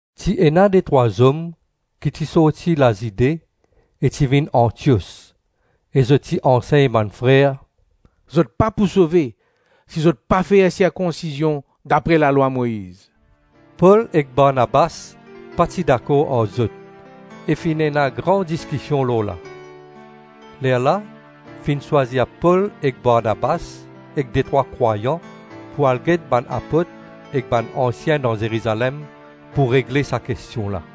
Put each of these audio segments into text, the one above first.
Ti ena detrwa zom ki ti sorti Lazide e ti vinn Antios, e zot ti ansegn bann frer, “Zot pa pou sove si zot pa fer sirkonsizion dapre lalwa Moiz.” Pol ek Barnabas pa ti dakor ar zot, e finn ena gran diskision lorla. Lerla, finn swazir Pol ek Barnabas ek detrwa krwayan pou al get bann apot ek bann ansien dan Zerizalem pou regle sa kestion la.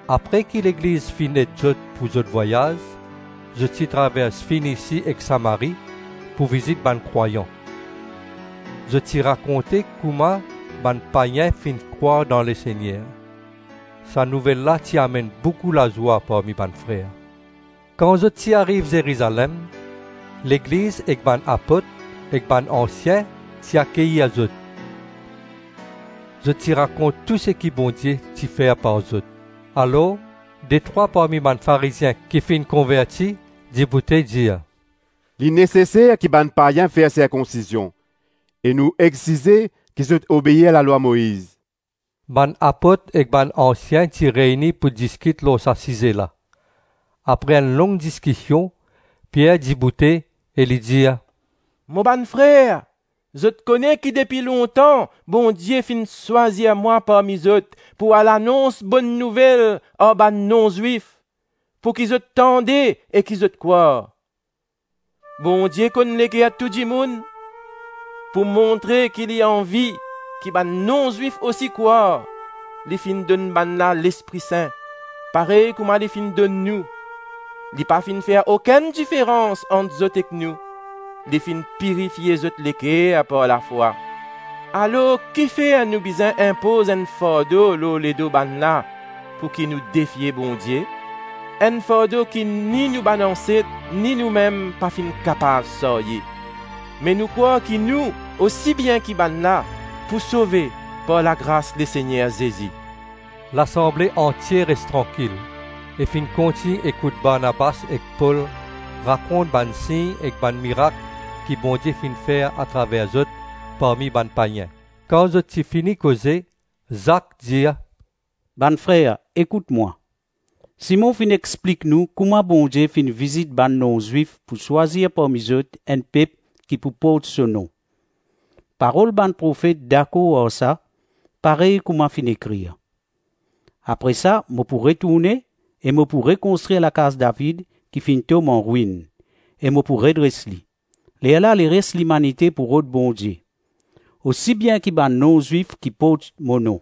Apre ki Legliz finn ed zot pou zot vwayaz, zot ti travers Fenisi ek Samari, pou vizit bann krwayan; zot ti rakonte kouma bann payin finn krwar dan Lesegner. Sa nouvel la ti amenn boukou lazwa parmi bann frer. Kan zot ti ariv Zerizalem, Legliz, ek bann apot ek bann ansien ti akeyir zot. Zot ti rakont tou seki Bondie ti fer par zot. Alor detrwa parmi bann Farizien ki finn konverti, diboute dir, “Li neseser ki bann payin fer sirkonsizion e nou exize ki zot obeir lalwa Moiz.” Bann apot ek bann ansien ti reyni pou diskit lor sa size la. Apre enn long diskision Pier diboute e li dir, “Mo bann frer, zot kone ki depi lontan Bondie finn swazir mwa parmi zot pou al anons Bonn Nouvel ar bann non-Zwif pouki zot tande e ki zot krwar. Bondie konn leker tou dimoun. Pou montre ki li anvi ki bann non-Zwif osi krwar, li finn donn bannla Lespri Sin, parey kouma li finn donn nou. Li pa finn fer okenn diferans ant zot ek nou, li finn pirifie zot leker par lafwa. Alors, kifer nou bizin inpoz enn fardo lor ledo bannla pouki nou defie Bondie? Enn fardo ki ni nou bann anset, ni noumem pa finn kapav sarye. Me nou krwar ki nou, osi bien ki bannla, pou sove par lagras Lesegner Zezi.” Lasanble antie res trankil, e finn kontign ekout Barnabas ek Pol rakont bann sign ek bann mirak ki Bondie finn fer atraver zot parmi bann payin. Kan zot ti fini koze, Zak dir, “Bann frer ekout mwa. Simon finn explik nou kouma Bondie finn vizit bann non-Zwif pou swazir parmi zot enn pep ki pou port so nom. Parol bann profet dakor ar sa, parey kouma finn ekrir, ‘Apre sa mo pou retourne e mo pou rekonstrir lakaz David ki finn tom anrwinn, e mo pou redres li. Lerla leres limanite pou rod Bondie, osi bien ki bann non-Zwif ki port mo nom.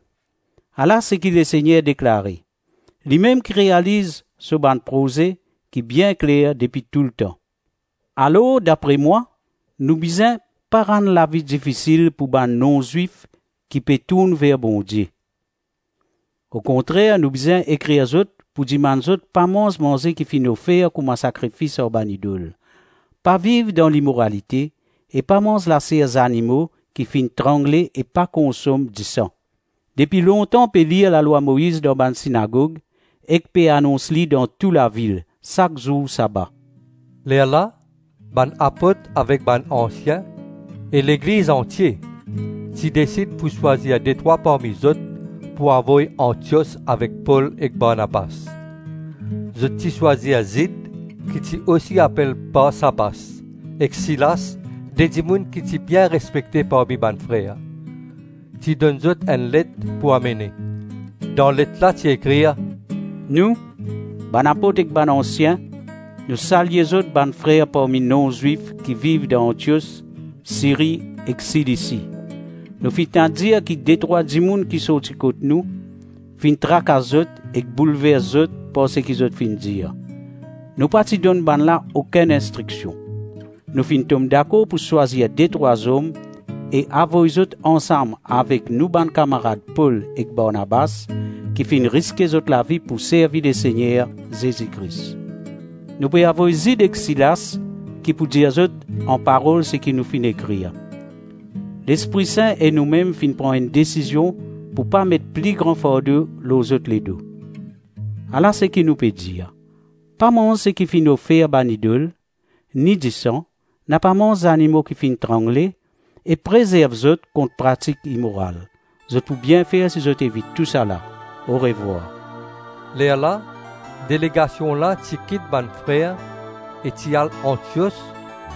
Ala seki Lesegner deklare, limem ki realiz so bann proze, ki bien kler depi toultan.’ Alors dapre mwa, nou bizin pa rann lavi difisil pou bann non-Zwif ki pe tourn ver Bondie. Okontrer nou bizin ekrir zot pou dimann zot pa manz manze ki finn ofer kouma sakrifis ar bann idol, pa viv dan limoralite, e pa manz laser zanimo ki finn trangle ek pa konsom disan. Depi lontan pe lir lalwa Moiz dan bann sinagog, ek pe anons li dan tou lavil, sak zour saba.” Lerla bann apot avek bann ansien, e Legliz antie, ti desid pou swazir detrwa parmi zot pou avoy Antios avek Pol ek Barnabas. Zot ti swazir Zid ki ti osi apel Barsabas, ek Silas, de dimoun ki ti bien respekte parmi bann frer. Ti donn zot enn let pou amene. Dan let la ti ekrir: “Nou, bann apot ek bann ansien, nou salye zot bann frer parmi non-Zwif ki viv dan Antios, Siri ek Silisi. Nou finn tann dir ki detrwa dimoun ki sorti kot nou, finn trakas zot ek boulvers zot par seki zot finn dir. Nou pa ti donn bannla okenn instriksion. Nou finn tom dakor pou swazir detrwa zom e avoy zot ansam avek nou bann kamarad Pol ek Barnabas, ki finn riske zot lavi pou servi Lesegner Zezi Kris. Nou pe avoy Zid ek Silas ki pou dir zot anparol seki nou finn ekrir. Lespri Sin e nou mem finn pran enn desizion pou pa met pli gran fardo lor zot ledo. Ala saki nou pe dir: Pa manz seki finn ofer bann idol, ni disan; napa manz zanimo ki finn trangle; e prezerv zot kont pratik imoral. Zot pou bien fer si zot evit tou sa la. Orevwar.” Lerla delegasion la ti kit bann frer e ti al Antios,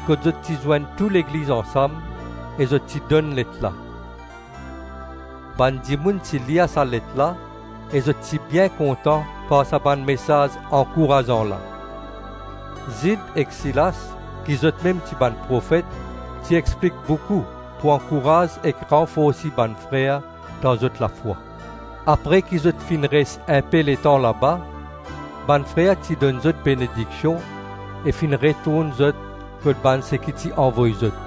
kot zot ti zwenn tou legliz ansam e zot ti donn let la. Bann dimoun ti lir sa let la e zot ti bien kontan par sa bann mesaz ankourazan la. Zid ek Silas, ki zotmem zot ti bann profet, ti explik boukou pou ankouraz ek ranforsi bann frer dan zot lafwa. Apre ki zot ti finn pas inpe letan la, bann frer ti donn zot benediksion ek finn retourn zot kot bann seki ti avoy zot. [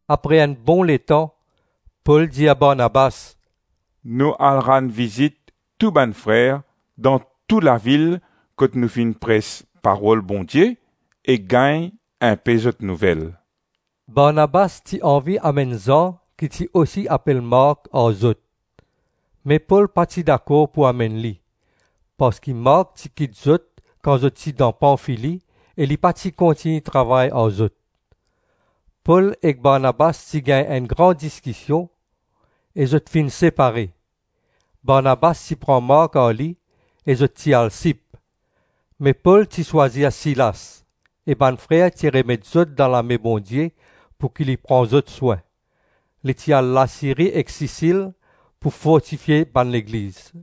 Apre enn bon letan Pol dir Barnabas, “Nou al rann vizit tou bann frer dan tou lavil kot nou finn pres parol Bondie ek gagn inpe zot nouvel.” Barnabas ti anvi amenn Zan ki ti osi apel Mark ar zot, Me Pol pa ti dakor pou amenn li, parski Mark ti kit zot kan zot ti dan Panfili ek li pa ti kontign travay ar zot. Pol ek Barnabas ti gagn enn gran diskision e zot finn separe. Barnabas ti pran Mark ar li ek zot ti al Sip. Me Pol ti swazir Silas, e bann frer ti remet zot dan lame Bondie pouki li pran zot swin. Li ti al Lasiri ek Sisil pou fortifie bann legliz.